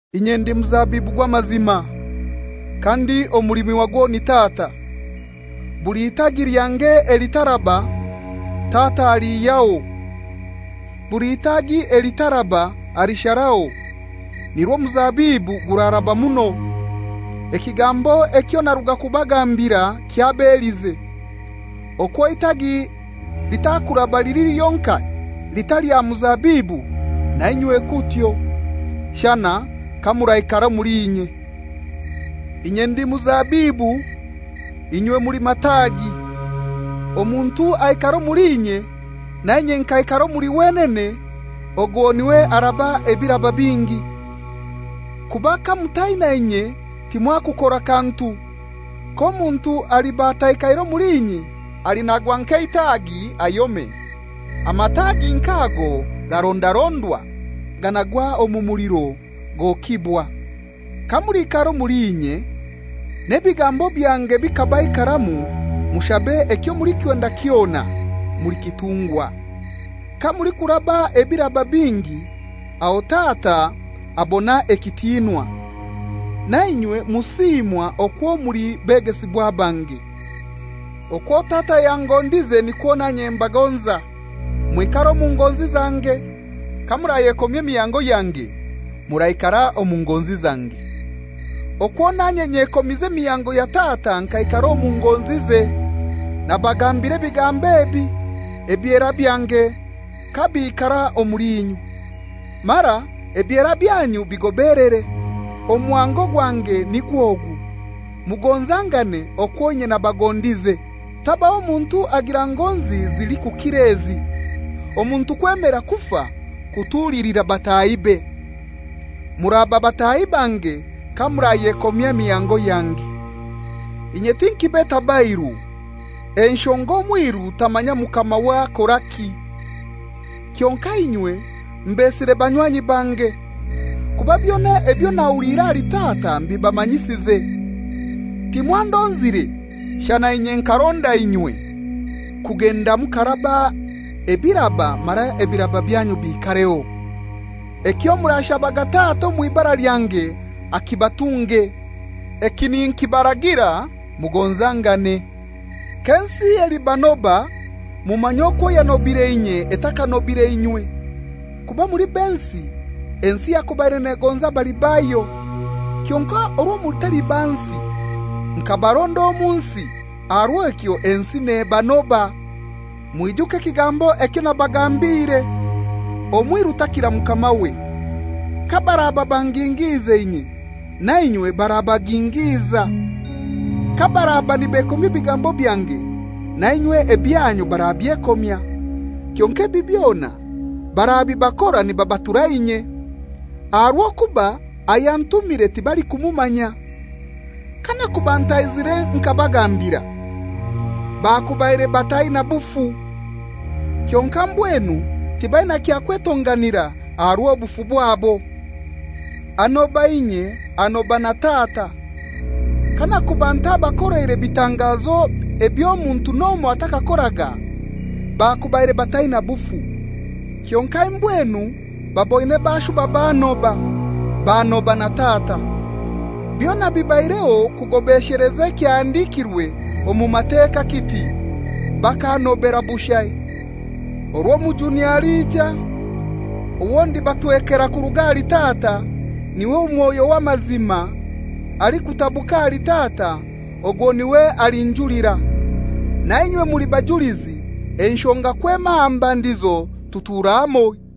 «Inye ndi muzabibu gw'amazima, kandi omulimi wagwo ni Tata. Buli itagi lyange elitaraba, Tata aliihyaho. Buli itagi elitaraba alisharaho, nirwo omuzabibu guraraba muno. Ekigambo ekyo naruga kubagambira kyabelize. Okwo eitagi litakuraba lili lyonkai litali aha muzabibu, nainywe kutyo, shana kamuraikara omuli inye. Inye ndi muzabibu, inywe muli mataagi. Omuntu aikara omuli inye, na inye nkaikara omuli wenene, ogwo n'iwe araba ebiraba bingi, kuba kamutaina inye timwakukora kantu. K'omuntu aliba ataikaire muli inye, alinagwa nk'eitagi ayome. Amatagi nk'ago garondarondwa, ganagwa omu muliro, gokibwa. Kamuliikara omuli inye n'ebigambo byange bikabaikaramu, mushabe ekyo mulikwenda kyona, mulikitungwa. Kamulikuraba ebiraba bingi, aho Tata abona ekitinwa, nainywe musiimwa okwo muli begesibwa bange. Okwo Tata yangondize nikwo nanye mbagonza; mwikare omu ngonzi zange. Kamurayekomya emihango yange muraikara omu ngonzi zange, okwo nanye nyekomize emihango ya Tata nkaikara omu ngonzize. Nabagambira ebigambo ebi, ebyera byange kabiikara omuli inywe, mara ebyera byanyu bigobelere. «Omuhango gwange nigw'ogu, mugonzangane okwo inye nabagondize. Tabaho muntu agira ngonzi zilikukira ezi, omuntu kwemera kufa kutulilira batahibe. Muraba bataahi bange kamurayekomya emihango yange. Inye tinkibeta bairu, enshonga omwiru tamanya mukamawe akoraki. Kyonkai inywe mbesire banywanyi bange; kuba byona ebyo nahuliire ahali Tata mbibamanyisize. Timwandonzire, shana inye nkaronda inywe, kugenda mukaraba ebiraba mara ebiraba byanyu biikareho; ekyo murashabaga Tata omw'ibara lyange akibatunge. Eki ninkibaragira, mugonzangane. «K'ensi elibanoba, mumanye okwo yanobire inye etakanobire inywe. Kuba muli b'ensi, ensi yakubaire negonza abali bayo. Kyonkai orwo mutali ba nsi, nkabaronda omu nsi, aha rw'ekyo ensi nebanoba. Mwijuke ekigambo ekyo nabagambiire, ‹Omwiru takira mukamawe.› Kabaraba bangingiize inye, nainywe barabagingiiza. Kabaraba nibekomya ebigambo byange, nainywe ebyanyu barabyekomya. Kyonkai ebi byona barabibakora nibabatura inye, aha rw'okuba ayantumire tibalikumumanya. Kanakuba ntaizire nkabagambira, bakubaire bataina bufu; kyonkai mbwenu tibaina kya kwetonganira aha rw'obufu bwanyu. Anoba inye anoba na Tata. Kanakuba ntabakoleire bitangazo eby'omuntu n'omoi atakakoraga, bakubaire bataina bufu; kyonkai mbwenu baboine bashuba bannoba, banoba na Tata. Byona bibaireho kugobesheleza ekyahandikirwe omu Mateka kiti, ‹Bakannobera bushai.› Orwo Omujuni alija, owo ndibatwekera kuruga ahali Tata, n'iwe Mwoyo w'amazima, alikutabuka ahali Tata, ogwo n'iwe alinjulira. Nainywe muli bajulizi, enshonga kwema aha mbandizo tutura hamoi.